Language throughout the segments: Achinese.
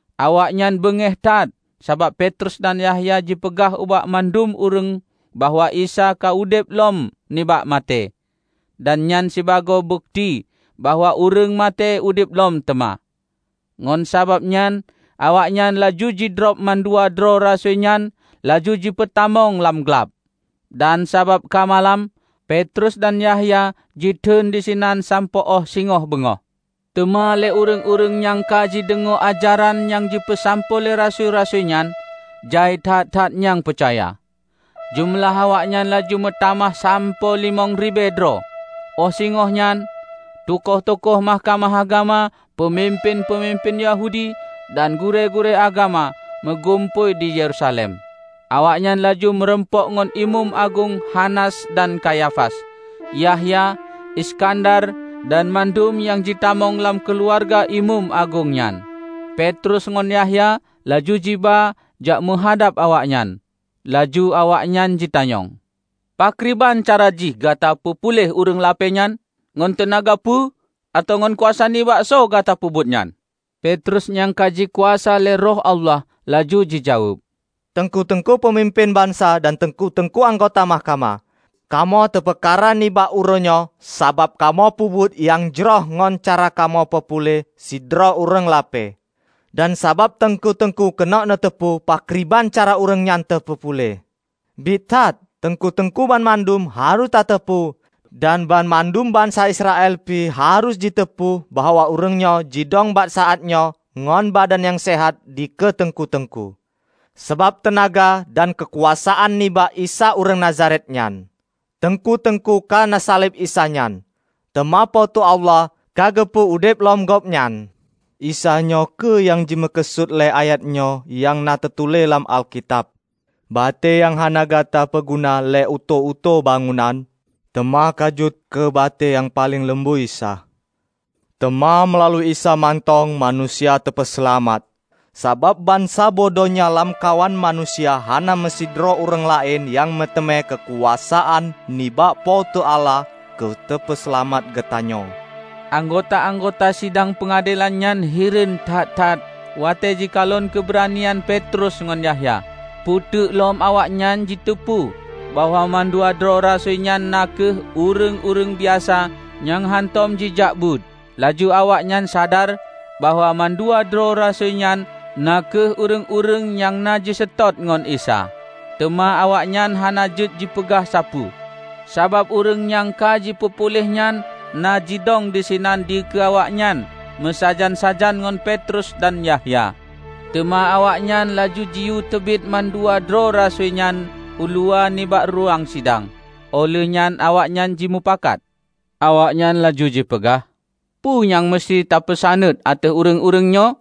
Awaknyan beungéh that sabab Petrus dan Yahya jipeugah ubak mandum ureuëng bahwa Isa ka udeb lom nibak maté, dan nyan sibagoe bukeuti bahwa ureuëng maté udeb lom teuma. Ngon sabab nyan awaknyan laju jidrob mandua droe rasui nyan laju jipeutamong lam glab. Dan sabab ka malam, Petrus dan Yahya jiteun disinan sampoe óh singoh beungoh. Teuma lé ureuëng-ureuëng nyang ka jideungoe ajaran nyang jipeusampoe lé rasui-rasui nyan, jai that-that nyang peucaya. Jeumeulah awaknyan laju meutamah sampoe limong ribée droe. Óh singoh nyan, tukoh-tukoh Mahkamah Agama, peumimpén-peumimpén Yahudi dan gurée-gurée agama meugumpôi di Yerusalem. Awaknyan laju meurumpok ngon Imeum Agong Hanas, dan Kayafas, Yahya, Iskandar, dan mandum nyang jitamong lam keuluwarga imeum agong nyan. Petrus ngon Yahya laju jiba jak meuhadab awaknyan, laju awaknyan jitanyong, "Pakriban cara jih gata peupuléh ureuëng lapée nyan? Ngon teunaga peue atawa ngon kuasa nibak soe gata peubuet nyan?" Petrus nyang ka jikuasa lé Roh Allah laju jijaweueb, "Teungku-teungku peumimpén bansa dan teungku-teungku anggota mahkamah! Kamoe teupeukara nibak uroenyoe sabab kamoe peubuet nyang jroh ngon cara kamoe peupuléh sidroe ureuëng lapée, dan sabab teungku-teungku keuneuk neuteupeue pakriban cara ureuëng nyan teupeupuléh. Biet that, teungku-teungku banmandum harôh tateupeue dan banmandum bansa Israel pih harôh jiteupeue bahwa ureuëng nyoe jidong bak saát nyoe ngon badan nyang seuhat dikeue teungku-teungku, sabab teunaga dan keukuasaan nibak Isa ureuëng Nazaret nyan. Teungku-teungku ka neusaleb Isa nyan, teuma Po teu Allah ka geupeu udeb lom Gobnyan. Isa nyoe kheueh nyang jimeukeusut lé ayat nyoe nyang na teutuléh lam Alkitab, 'Batée nyang hana gata peuguna lé utôh-utôh bangunan, teuma ka jeuet keu batée nyang paleng lumboi sa.' Teuma meulalu Isa mantong manusia teupeuseulamat. Sabab bansaboh donya lamkawan manusia hana meusidroe ureuëng laén nyang meuteumé keukuasaan nibak Po teu Allah keu teupeuseulamat geutanyoe." Anggota-anggota sidang peungadelan nyan hireuen that-that watée jikalon keubeuranian Petrus ngon Yahya, peuteuk lom awaknyan jiteupeue bahwa mandua droe rasui nyan na kheueh ureuëng-ureuëng biasa nyang hántom jijak beuet. Laju awaknyan sadar bahwa mandua droe rasui nyan na kheueh ureuëng-ureuëng nyang na jiseutôt ngon Isa. Teuma awaknyan hana jeuet jipeugah sapeue, sabab ureuëng nyang ka jipeupuléh nyan na jidong disinan dikeue awaknyan meusajan-sajan ngon Petrus dan Yahya. Teuma awaknyan laju jiyue teubiet mandua droe rasui nyan uluwa nibak ruweueng sidang. Óh lheuehnyan awaknyan jimupakat. Awaknyan laju jipeugah, "Peue nyang museuti tapeusaneut ateueh ureuëng-ureuëng nyoe?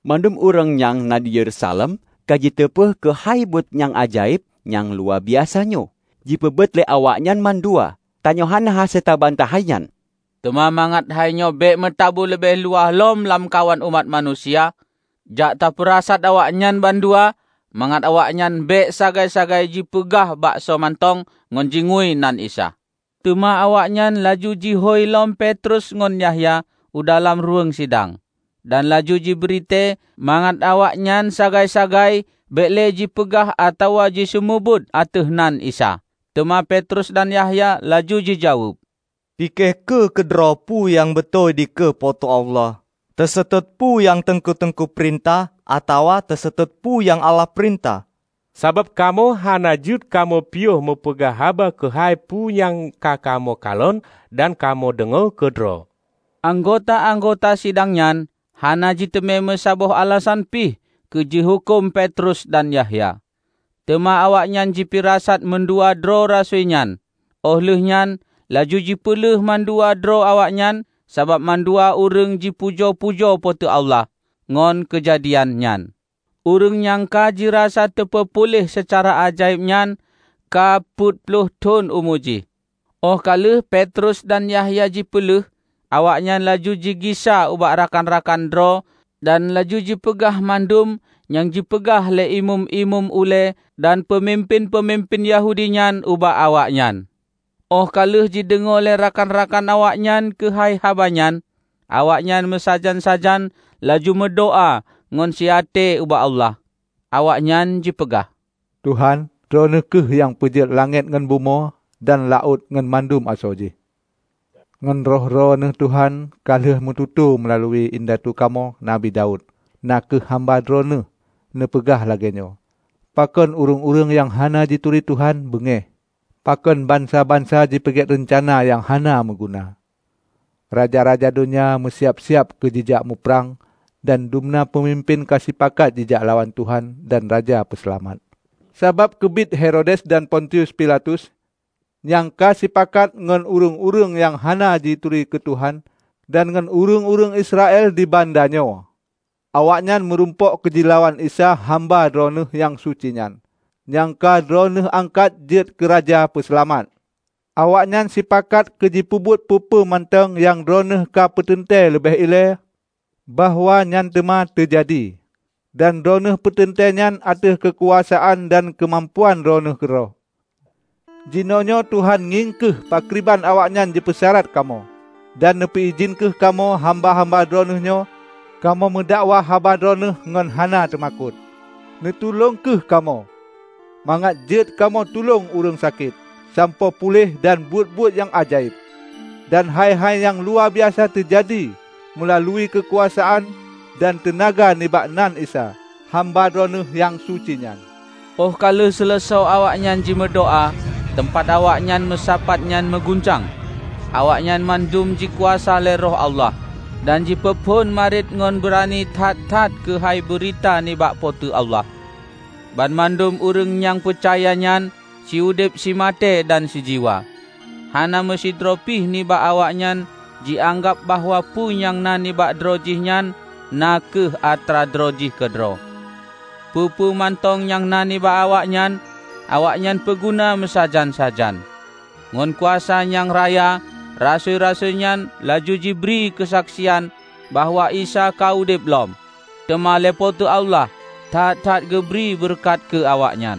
Mandum ureuëng nyang na di Yerusalem ka jiteupeue keuhai buet nyang ajaéb nyang luwabiasa nyoe, jipeubuet lé awaknyan mandua. Tanyoe hana hase tabantah hainyan. Teuma mangat hainyoe bék meutabu leubeh luwah lom lamkawan umat manusia, jak ta peurasat awaknyan bandua mangat awaknyan bék sagai-sagai jipeugah baksoe mantong ngon jingui nan Isa." Teuma awaknyan laju jihôi lom Petrus ngon Yahya u dalam ruweueng sidang, dan laju jibritée mangat awaknyan sagai-sagai bék le jipeugah atawa jiseumeubeuet ateueh nan Isa. Teuma Petrus dan Yahya laju jijaweueb, "Pike kheueh keudroe peue nyang beutôi dikeue Po teu Allah: teuseutôt peue nyang teungku-teungku peurintah atawa teuseutôt peue nyang Allah peurintah. Sabab kamoe hana jeuet kamoe piôh meupeugah haba keuhai peu nyang ka kamoe kalon dan kamoe deungoe keudroe." Anggota-anggota sidang nyan hana jiteumé meusaboh alasan pih keu jihuköm Petrus dan Yahya. Teuma awaknyan jipirasat mandua droe rasui nyan, óh lheueh nyan laju jipeuleueh mandua droe awaknyan, sabab mandum ureuëng jipujoe-pujoe Po teu Allah ngon keujadian nyan. Ureuëng nyang ka jirasa teupeupuléh seucara ajaéb nyan ka peuet ploh thon umu jih. Óh ka lheueh Petrus dan Yahya jipeuleueh, awaknyan laju jigisa ubak rakan-rakan droe dan laju jipeugah mandum nyang jipeugah lé imeum-imeum ulée dan peumimpén-peumimpén Yahudi nyan ubak awaknyan. Óh ka lheueh jideungoe lé rakan-rakan awaknyan keuhai haba nyan, awaknyan meusajan-sajan laju meudoá ngon siaté ubak Allah. Awaknyan jipeugah, "Tuhan, Droeneueh kheueh nyang peujeuet langét ngon bumoe dan laôt ngon mandum asoe jih. Ngon Roh Droeneueh Tuhan ka lheueh neumeututoe meulalu indatu kamoe, Nabi Daud, na kheueh hamba Droeneueh: Neupeugah lagée nyoe, 'Pakon ureuëng-ureuëng, nyang hana jituri Tuhan beungéh; pakon bansa-bansa jipeuget reuncana nyang hana meuguna? Raja-raja donya meusiab-siab keu jijak muprang, dan dumna peumimpén ka sipakat jijak lawan Tuhan dan Raja Peuseulamat.' Sabab keubiet Herodes dan Pontius Pilatus nyang ka sipakat ngon ureuëng-ureuëng nyang hana jituri keu Tuhan dan ngon ureuëng-ureuëng Israel di banda nyoe. Awaknyan meurumpok keu jilawan Isa hamba Droeneueh nyang suci nyan, nyang ka Droeneueh angkat jeuet keu Raja Peuseulamat. Awaknyan sipakat keu jipeubuet peue-peue mantong, nyang Droeneueh ka neupeuteuntée leubeh ilée bahwa nyan teuma teujadi. Dan Droeneueh peuteuntée nyan ateueh keukuasaan dan keumampuan Droeneueh keudroe. Jinoenyoe, Tuhan, ngieng kheueh pakriban awaknyan jipeurasat kamoe. Dan neupeue idhin kheueh kamoe, hamba-hamba Droeneueh nyoe, kamoe meudakwah haba Droeneueh ngon hana teumakot. Neutulông kheueh kamoe mangat jeuet kamoe tulông ureuëng sakét sampoe puléh dan buet-buet nyang ajaéb dan hai-hai nyang luwabiasa teujadi meulalu keukuasaan dan teunaga nibak nan Isa, Hamba Droeneueh nyang suci nyan." Óh ka seuleusoe awaknyan jimeudoá, teumpat awaknyan meusapat nyan meuguncang. Awaknyan mandum jikuasa lé Roh Allah, dan jipeuphon mariet ngon beurani that-that keuhai beurita nibak Po teu Allah. Banmandum ureuëng nyang peucaya nyan siudeb simaté dan sijiwa. Hana meusidroe pih nibak awaknyan jianggab bahwa peue nyang na nibak droe jihnyan na kheueh atra droe jih keudroe. Peue-peue mantong nyang na nibak awaknyan, awaknyan peuguna meusajan-sajan. Ngon kuasa nyang raya, rasui-rasui nyan laju jibri keusaksian bahwa Isa ka udeb lom. Teuma lé Po teu Allah that-that geubri beureukat keu awaknyan.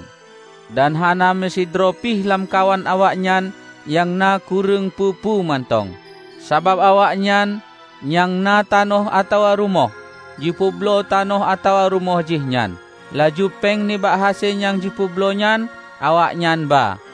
Dan hana meusidroe pih lamkawan awaknyan nyang na kureueng peue-peue mantong. Sabab awaknyan nyang na tanoh atawa rumoh, jipeubloe tanoh atawa rumoh jih nyan; laju péng nibak hase nyang jipeubloe nyan awaknyan ba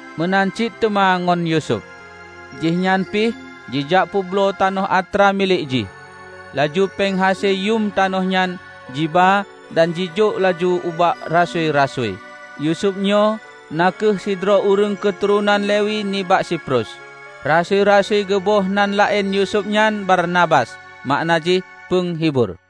Meunan cit teuma ngon Yusuf. Jihnyan pih jijak peubloe tanoh atra milék jih. Laju péng hase yuem tanoh nyan jiba dan jijok laju ubak rasui-rasui. Yusuf nyoe na kheueh sidroe ureuëng keuturonan Lewi nibak Siprus: rasui-rasui geuboh nan laén Yusuf nyan Barnabas (makna jih Peunghibur).